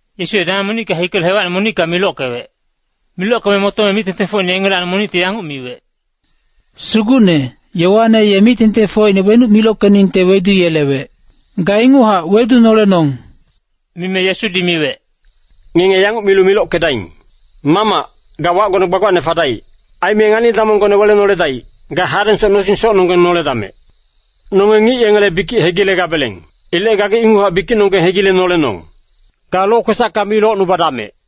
Yesu ye dameng monicka hikelu hewacine monicka milockewec. Milockeme motome mic-tengtengfocine yengelacni monicti yanguc miwec, “Sugucne, Yoane ye mic-tengtengfocine wenuc milockeningte weduyelewec. Ga inguchac wedunolenong!” Mime Yesudi miwec, “Ngenge yanguc milu milockedaing. ‘Mamac, ga wacgone gbagbacne fadaic. Aime ngani-damonggone welenoledaic. Ga hadengsoc nosing socnonggeng noledamec. Nonge ngic yengele bikic hegilegabeleng. Ilec gagi inguchac bikicnonggeng hegilenolenong. Ga lokwesacka mi locnubadamec.’”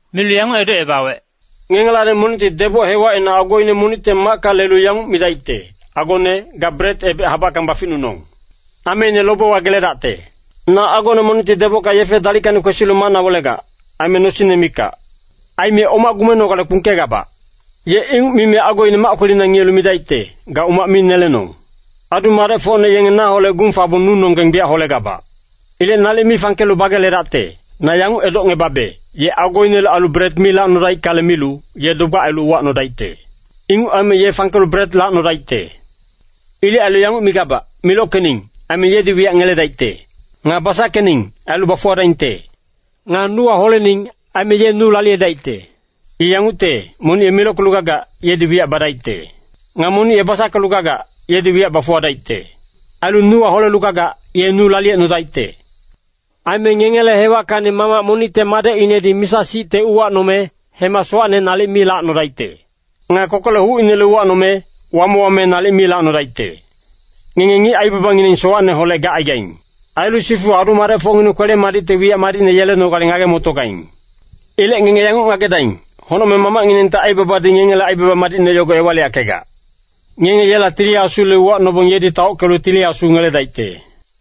Milu yanguc edocebawec, “Ngengelacni monicti deboc hewacina agoine monicte macka lelu yanguc midaicte, ‘Agone, ga bret ebec habackang baficnunong. Ameine lobewa geledacte. Na agone monicti debocka yefe dalickacni kwesilu macna welegac, aime nosingne mikac. Aime oma gumenogale kpungkegabac.’ “Ye inguc mime agoine mac kwelina ngiyelu midaicte, ‘Ga umac mi nelenong! Adu-madecfocne yenge naholec gung fabong nunonggeng biyac holegabac. Ilec nalic mi fangkelu bageledacte.’ Na yanguc edocngebabe, ye agoinele ailu bret mi lacnodaickale milu, ye dogbac ailu uwacnodaicte. Inguc aime ye fangkelu bret lacnodaicte. “Ilec ailu yanguc migabac, milockening, aime yedi wiyac ngeledaicte. Nga basackening, ailu bafuwadaingte. Nga nuwa holening, aime ye nu laliyedaicte. I yangucte, monic ye milockelu gagac, yedi wiyac badaicte. Nga monic ye basackelu gagac, yedi wiyac bafuwadaicte. Ailu nuwa holelu gagac, ye nu laliyecnodaicte. “Aime ngengele hewackacni mamac monicte madecinedi misa-sicte uwacnome, hema sowacne nalic mi lacnodaicte. Nga kokolec hucinele uwacnome, wame-wame nalic mi lacnodaicte. Ngenge ngic aibabangineng sowacneholec gacaigaing. Ailu sifu adu-madecfocngineng kwele-madicte wiyac madicne yelenogale ngage-motogaing. Ilec ngenge yanguc ngagedaing, Honocmeng Mamacnginengte aibabadi ngengele aibaba madicne yogo ewaliyackegac. Ngenge yela Tili Asule uwacnobong yedi taockelu Tili Asu ngeledaicte.”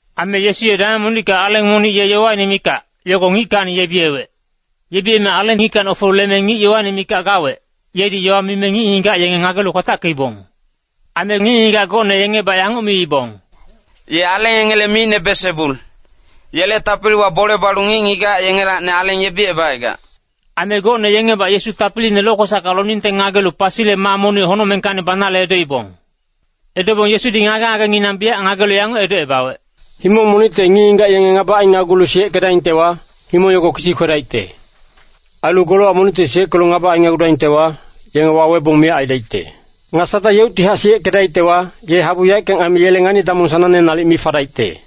Aime Yesu ye dameng monicka aleng monic yowaine mikac, yogo ngickacni yebiyewec. Yebiyeme aleng ngickacni ofelu hikeme ngic yowaine mikac gawec, yedi yowa mime ngic-ngigac yenge ngagelu kwatackeibong. Aime ngic-ngigac gocne yengibac yanguc miibong, “Ye aleng yengele micne Belsebul, yele tapiliwa bole balu ngic-ngigac yengelacni aleng yebicebacaigac.” Aime gocne yengibac Yesu tapiliine lokwesacka loningte ngagelu pasile maa monic honocmengkacni banale edoibong. Edobong Yesudi ngage-ngagenginang biyac ngagelu yanguc edocebawec, “Himong monicte ngic-ngigac yenge ngaba ainagulu siyeckedaingtewa, himong yogo kisi kwedaicte. Ailu golowac monicti siyeckelu ngaba ainagudaingtewa, yenge wawebong miyac aidaicte. Nga Satang yeuctihac siyeckedaictewa, ye habu yaeckang aime yele ngani-damong sanangne nalic mi fadaicte.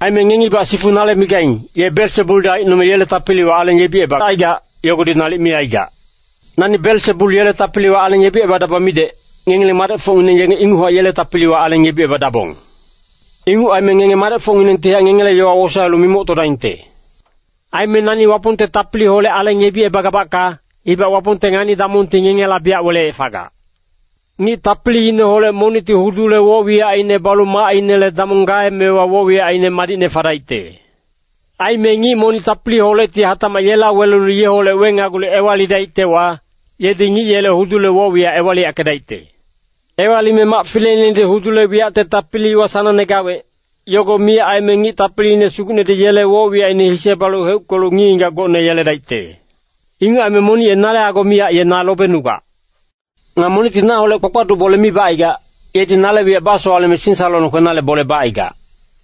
Aime ngengibac sifu nale migaing, ‘Ye Belsebuldi aicnome yele tapiliwa aleng yebicebacaigac, yogodi nalic mi aigac.’ Nani Belsebul yele tapiliwa aleng yebicebadaba midec, ngengileng madecfocngineng yenge inguchac yele tapiliwa aleng yebicebadabong. Inguc aime ngenge madecfocnginengtihac ngengele yowa wosaelu mimoctodaingte. Aime nani Wapongte tapiliholec aleng yebicebagabacka, ibac Wapongte ngani-damongti ngengela biyac weleyec fagac. “Ngic tapiliineholec monicti hudule woc-wiyacine balu macinele damong gaemewa woc-wiyacine madicne fadaicte. Aime ngic monic tapiliholecti hatacmac yela welelu yeholec wenagulu ewalidaictewa, yedi ngic yele hudule woc-wiyac ewaliyackedaicte. Ewalime mac fileinedi hudule wiyacte tapiliwa sanangne gawec, yogo miyac aime ngic tapiliine sugucnedi yele woc-wiyacine hise balu heuckelu ngic-ngigac gocne yeledaicte. “Inguc aime monic ye nale ago miyac ye na lobenugac. Nga monicti naholec bakpaduc bole mi bacaigac, yedi nale wiyac basowaleme singsalolong kwenale bole bacaigac.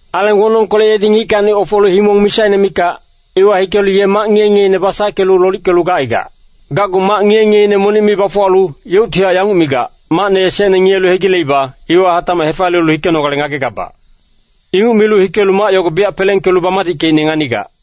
“Aleng wonongkolec yedi ngickacni ofelu himong misaine mikac, iwa hikelu ye mac ngiye-ngiyeine basackelu lolickelu gacaigac. Gacgu mac ngiye-ngiyeine monic mi bafuwalu, yeuctihac yanguc migac, ‘Macne esecne ngiyelu hegileiba, iwa hatacmac hefaliyelu hikenogale ngagegabac.’ Inguc milu hikelu mac yogo biyac pelengkelu bamadickeicne nganigac.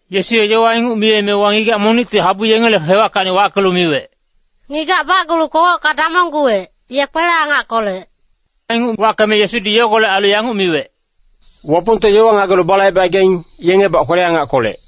Yesu ye yowa inguc miyemewa ngigac monicti habu yengele hewackacni wackelu miwec, “Ngigac bacgulu kogocka damongguwec, ye kwele-angackolec.” Inguc wackeme Yesudi yogolec ailu yanguc miwec, “Wapongte yowa ngagelu balaibecaigaing, yengebac kwele-angackolec.”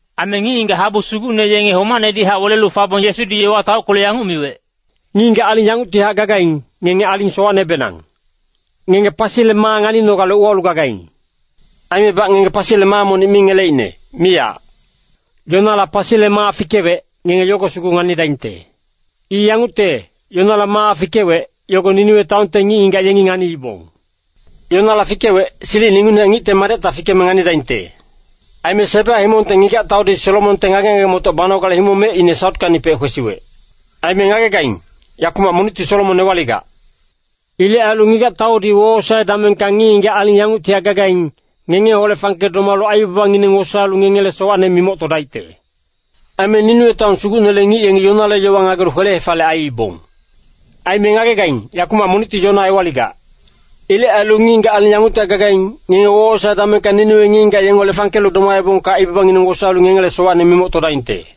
Aime ngic-ngigac habu sugucne yenge homacnehac welelu fabong, Yesudi yowa taockelu yanguc miwec, “Ngic-ngigac aling yanguctihac gagaing, ngenge aling sowacnebenang. Ngenge pasile maa nganinogale uwalu gagaing. Aimebac ngenge pasile maa monic mi ngeleicne, miyac. Yonala pasile maa fikewec, ngenge yogo sugu nganidaingte. I yangucte, Yonala maa fikewec, yogo Niniwe taonte ngic-ngigac yengi nganiibong. Yonala fikewec, silicine ingucnehac Ngicte Madecta fikeme nganidaingte. Aime Seba himongte ngigac-taudi Solomonte ngage-ngage-motoc banogale himong mecine sautkacnipec kwesiwec. Aime ngagegaing, yakumac monicti Solomon ewaligac. Ilec ailu ngigac-taudi wowosae damengka ngic-ngigac aling yanguctihac gagaing, ngengeholec fangke domalu aibabangineng wosaelu ngengele sowacne mimoctodaicte. Aime Niniwe taon sugucnele ngic yengi Yonale yowa ngagelu kwele-hefaliyec aiibong. Aime ngagegaing, yakumac monicti Yona ewaligac. Ilec ailu ngic-ngigac aling yanguctihac gagaing, ngenge wowosae damengka Niniwe ngic-ngigac yengeholec fangkelu domaebongka aibabangineng wosaelu ngengele sowacne mimoctodaingte.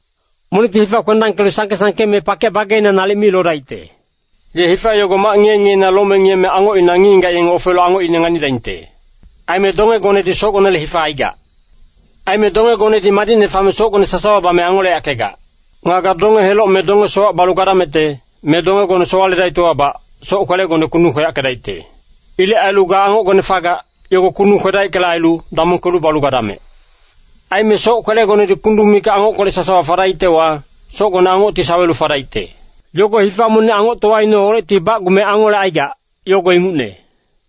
“Monicti hifa kwendangkelu sangke-sangke me pakec bageina nalic mi lodaicte. Ye hifa yogo mac ngiye-ngiyeina lome ngiyeme angocina ngic-ngigac yenge ofelu angocine nganidaingte. Aime dongegonedi socgonele hifa aigac. Aime dongegonedi madicne fame socgone sasawa bame angoleyackegac. Nga ga donge-heloc me donge-sowac balu gadamecte, me dongegone sowaledaictewabac, soc-kwelegone kundung kweyackedaicte. Ilec ailu ga angocgone fagac, yogo kundung kwedaickale ailu, damongkelu balu gadamec! Aime soc-kwelegonedi kundung mikac angockolec sasawa fadaictewa, socgone angocti sawelu fadaicte. Yogo hifa monic angoctowaineholecti bacgume angolecaigac, yogo ingucne.”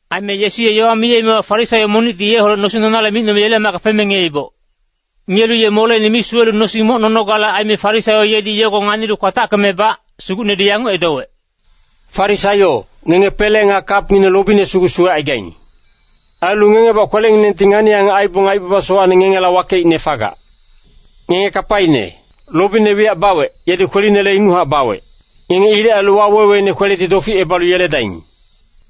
Aime Yesu ye yowa mime Farisaio monicti yeholec nosing nonale micnome yele macka feme ngiyeiboc. Ngiyelu ye moleine mi suwelu nosing moc nonogale aime, Farisaio yedi yogo nganilu kwatackemebac, Sugucnedi yanguc edowec, “Farisaio, ngenge pele nga kapngineng lobine sugu suwecaigaing. Ailu ngengebac kwelenginengti ngani-angac aibong aibaba sowacne ngengela wakeicne fagac. Ngenge kapaine! Lobine wiyac bawec, yedi kwelinele inguchac bawec. Ngenge ilec ailu waweweine kweledi doficebalu yeledaing!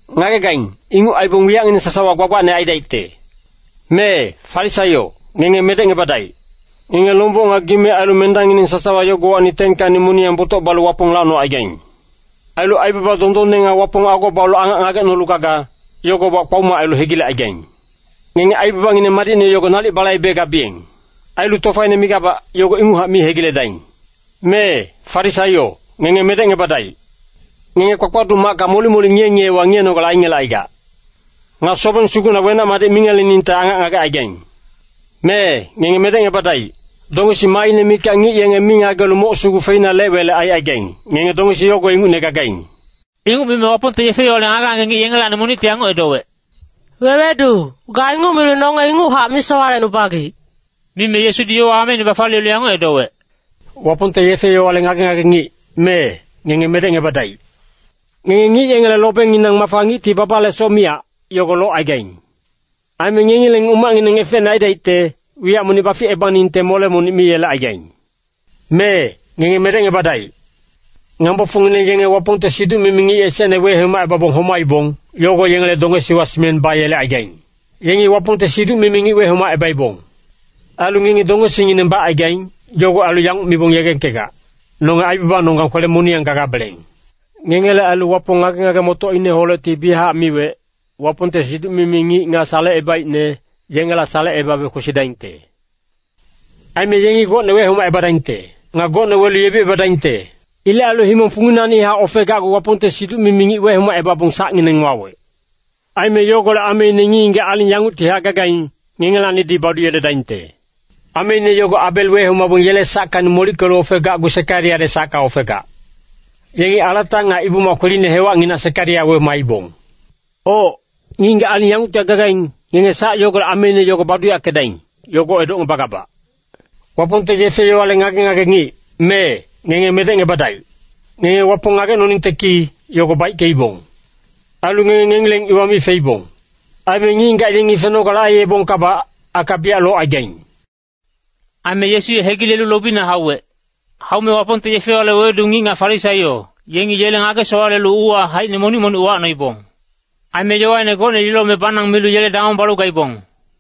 Ngagegaing, inguc aibong wiyacngineng sasawa gbagbacne aidaicte. “Mee, Farisaio, ngenge medecngebadaic. Ngenge lomboc nga gime ailu mendangngineng sasawa yogowacni 10kacni moniyang botoc balu Wapong lacnocaigaing. Ailu aibaba dondonne nga Wapong ago balu angac ngagecnolu gaga, yogobac kpaoma ailu hegilecaigaing. Ngenge aibabangineng madicne yogo nalic balaibegabiyeng. Ailu tofaine migabac, yogo inguchac mi hegiledaing. “Mee, Farisaio, ngenge medecngebadaic. Ngenge kpakpaduc macka molic-molic ngiye-ngiyewa ngiyenogale aingelecaigac. Nga sobeng sugucna wenac-madic mingeleningte angac ngagecaigaing. “Mee, ngenge medecngebadaic. Dongesi maaine mikac ngic yenge mi ngagelu moc sugu feina lec-welec aicaigaing, ngenge dongesi yogo ingucne gagaing.” Inguc mime Wapongte yefe-yowale ngage-ngage ngic yengelacni monicti yanguc edowec, “Wewedu, ga inguc milu nonge inguchac misowalecnubagic.” Mime Yesudi yowa ameine bafaliyelu yanguc edowec, “Wapongte yefe-yowale ngage-ngage ngic, mee, ngenge medecngebadaic! Ngenge ngic yengele lobenginang mafa ngicti babalesoc miyac, yogo locaigaing. Aime ngengileng umacngineng efecne aidaicte, wiyac monic baficebaningte mole monic mi yelecaigaing. “Mee, ngenge medecngebadaic. Ngambofocngineng yenge Wapongte siduc-mimi ngic esecne wehomacebabong homaibong, yogo yengele dongesiwa simeng bayelecaigaing. Yengi Wapongte siduc-mimi ngic wehomacebaibong. Ailu ngengi dongesingineng bacaigaing, yogo ailu yanguc mibong yegengkegac, ‘Nonge aibabanonggang kwele-moniyang gagabeleng.’ Ngengele ailu Wapong ngage-ngage-motocineholecti biyachac miwec, ‘Wapongte siduc-mimi ngic nga salecebaicne, yengela salecebabe kwesidaingte. Aime yengi gocne wehomacebadaingte. Nga gocne welu yebicebadaingte.’ Ilec ailu himong funginacnihac ofegacgu Wapongte siduc-mimi ngic wehomacebabong sacngineng wawec. Aime yogolec ameine ngic-ngigac aling yanguctihac gagaing, ngengelacnidi baduyeledaingte. Ameine yogo Abel wehomabong yele sackacni molickelu ofegacgu Sekariyale sacka ofegac. Yengi alata nga Ibu-mac kweline hewacnginac Sekariya wehomaibong. Oc, ngic-ngigac aling yanguctihac gagaing, ngenge sac yogolec ameine yogo baduyackedaing, yogo edocngebagabac. “Wapongte yefe-yowale ngage-ngage ngic, mee, ngenge medecngebadaic. Ngenge Wapong ngagecnoningte ki, yogo baickeibong. Ailu ngenge ngengileng iwa mi feibong. Aime ngic-ngigac yenge fenogale aiyebongkabac, aka biyac locaigaing.” Aime Yesu ye hegilelu lobina hauwec. Haume Wapongte yefe-yowale wewedu ngic nga Farisaio, yengi yele ngage-sowalelu uuwa haicine monic-monic uwacnoibong. Aime yowaine gocne lilome banang milu yele damong balu gaibong.